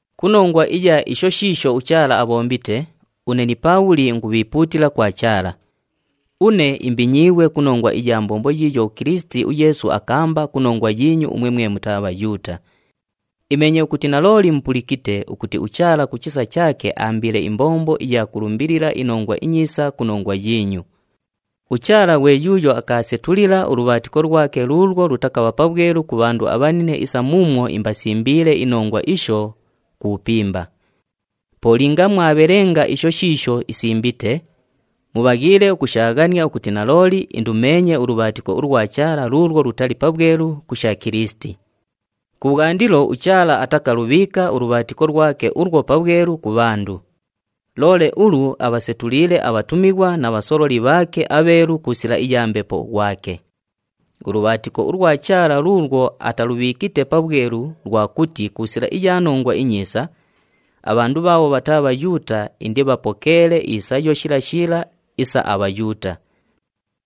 Ku nongwa iya isho shiisho uChaala abhombite, une ni Paabhuli ingubhiipuutila kwa Chaala. Une imbinyiighwe ku nongwa iya mbombo yiiyo uKilisiti uYeesu akaamba ku nongwa yiinyu umwe mwe mutaa Bhayuuta. Imeenye ukuti nalooli mupulikite ukuti uChaala ku chisa chaake aambiile imbombo iya kulumbilila iNongwa iNyiisa ku nongwa yiinyu. UChaala ghwe yuuyo akaasetulila ulubhaatiko lwake luulwo lutakabha pabhwelu ku bhandu abhanine isa muumwo imbasimbiile inongwa isho ku bhupimba. Po linga mwabhelenga isho shiisho isimbite, mubhaghiile ukushaaghania ukuti nalooli indumeenye ulubhaatiko ulwa Chaala luulwo lutali pabhwelu ku sha Kilisiti. Kubhwandilo uChaala atakalubhiika ulubhaatiko lwake ulwo pabhwelu ku bhandu. Loole ulu abhasetuliile abhatumighwa na bhasololi bhaake abheelu ku sila iya Mbepo ghwake. Ulubhaatiko ulwa Chaala luulwo atalubhiikite pabhwelu lwa kuti ku sila iya Nongwa iNyiisa, abhandu bhaabho bhataa Bhayuuta indibhapokeele isayo shila shila isa aBhayuuta.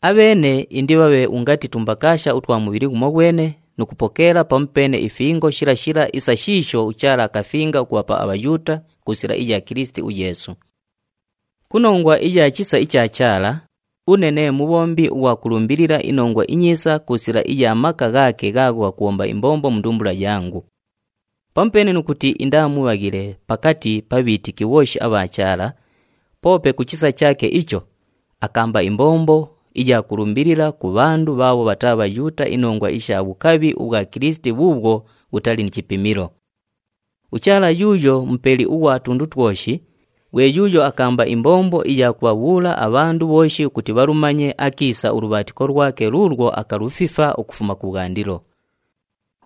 Abheene indibhabhe ungati tumbakaasha utwa mubhili ghumoghwene nu kupokeela pamupeene ifingo shila shila isa shiisho uChaala akafinga ukubhapa aBhayuuta ku sila iya Kilisiti uYeesu. Ku nongwa iya chisa icha Chaala, une nee mubhombi ughwa kulumbilila iNongwa iNyiisa ku sila iya maka ghaake ghaagho ghakubhomba imbombo mu ndumbula yangu. Pamupeene nu kuti indaa mubhaghile pakati pa bhiitiki bhooshi abha Chaala, poope ku chisa chaake icho, akaamba imbombo iya kulumbilila ku bhandu bhaabho bhataa Bhayuuta inongwa isha bhukabhi ubhwa Kilisiti bhuubhwo bhutali ni chipimilo. UChaala yuuyo Mupeli ughwa tundu twoshi, ghwe yuuyo akaamba imbombo iya kubhabhuula abhandu bhooshi ukuti bhalumanye akiisa ulubhaatiko lwake luulwo akalufifa ukufuma kubhwandilo.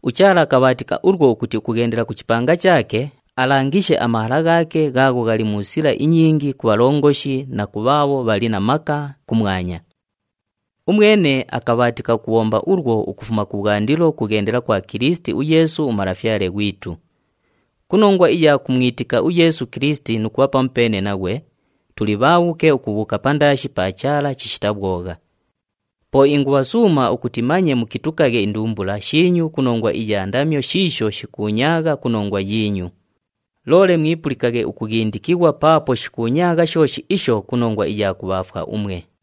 UChaala akabhaatika ulwo ukuti ukughendela ku chipanga chaake, alangishe amahala ghaake ghaagho ghali mu sila inyingi ku bhalongoshi na ku bhaabho bhali na maka kumwanya. Umwene akabhaatika ukubhomba ulwo ukufuma kubhwandilo ukughendela kwa Kilisiti uYeesu uMalafyale ghwitu. Ku nongwa iya kumwitika uYeesu Kilisiti nu kubha pamupeene naghwe, tuli bhaabhuke ukubhuuka pandaashi pa Chaala chishita bhwogha. Po ingubhasuuma ukuti manye mukitukaghe indumbula shiinyu ku nongwa iya ndamyo shiisho shikuunyaagha ku nongwa yiinyu, loole mwipulikaghe ukughindikighwa paapo shikuunyaagha shooshi isho ku nongwa iya kubhaafwa umwe.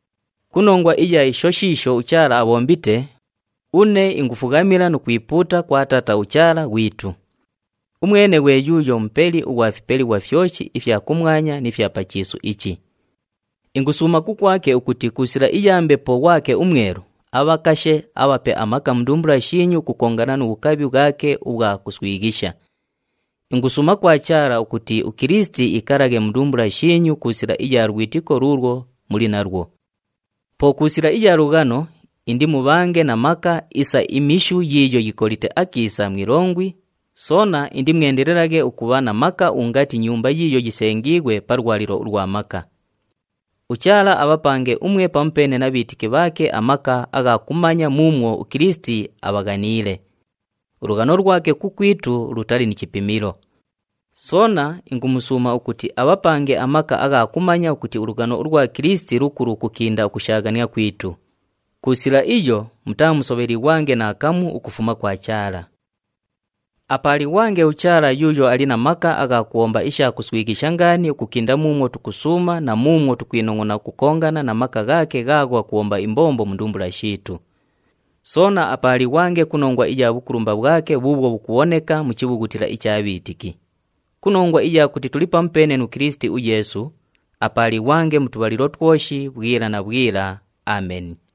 Ku nongwa iya isho shiisho uChaala abhombite, une ingufughamila nu kwipuuta kwa Taata uChaala ghwitu. Umwene ghwe yuuyo Mupeli ughwa fipelighwa fyoshi ifya kumwanya ni fya pa chiisu ichi. Ingusuuma kukwake ukuti ku sila iya Mbepo ghwake uMwelu, abhakashe, abhape amaka mu ndumbula shiinyu ukukongana nu bhukabhi bhwake ubhwa kuswighisha. Ingusuuma kwa Chaala ukuti uKilisiti iikalaghe mu ndumbula shiinyu ku sila iya lwitiko luulwo muli nalwo. Po ku sila iya lughano, indimubhange na maka isa imishu yiiyo yikolite akiisa mu ilongwi, soona indimwendelelaghe ukubha na maka ungati nyumba yiiyo yisengiighwe pa lwalilo ulwa maka. UChaala abhapange umwe pamupeene na bhiitiki bhaake amaka agha kumanya muumwo uKilisiti abhaghaniile. Ulughano lwake kukwitu lutali ni chipimilo. Soona ingumusuuma ukuti abhapange amaka agha kumanya ukuti ulughano ulwa Kilisiti lukulu ukukinda ukushaaghania kwitu. Ku sila iyo mutaamusobhelighwange naakamu ukufuma kwa Chaala. Apaalighwange uChaala yuuyo ali na maka agha kubhomba isha kuswighisha ngaani ukukinda muumwo tukusuuma na muumwo tukwinongʼona ukukongana na maka ghaake ghaagho ghakubhomba imbombo mu ndumbula shiitu. Soona apaalighwange ku nongwa iya bhukulumba bhwake bhuubhwo bhukubhoneka mu chibhughutila icha bhiitiki. Ku nongwa iya kuti tuli pamupeene nu Kilisiti uYeesu, apaalighwange mu tubhalilo twoshi bhwila na bhwila. Ameni.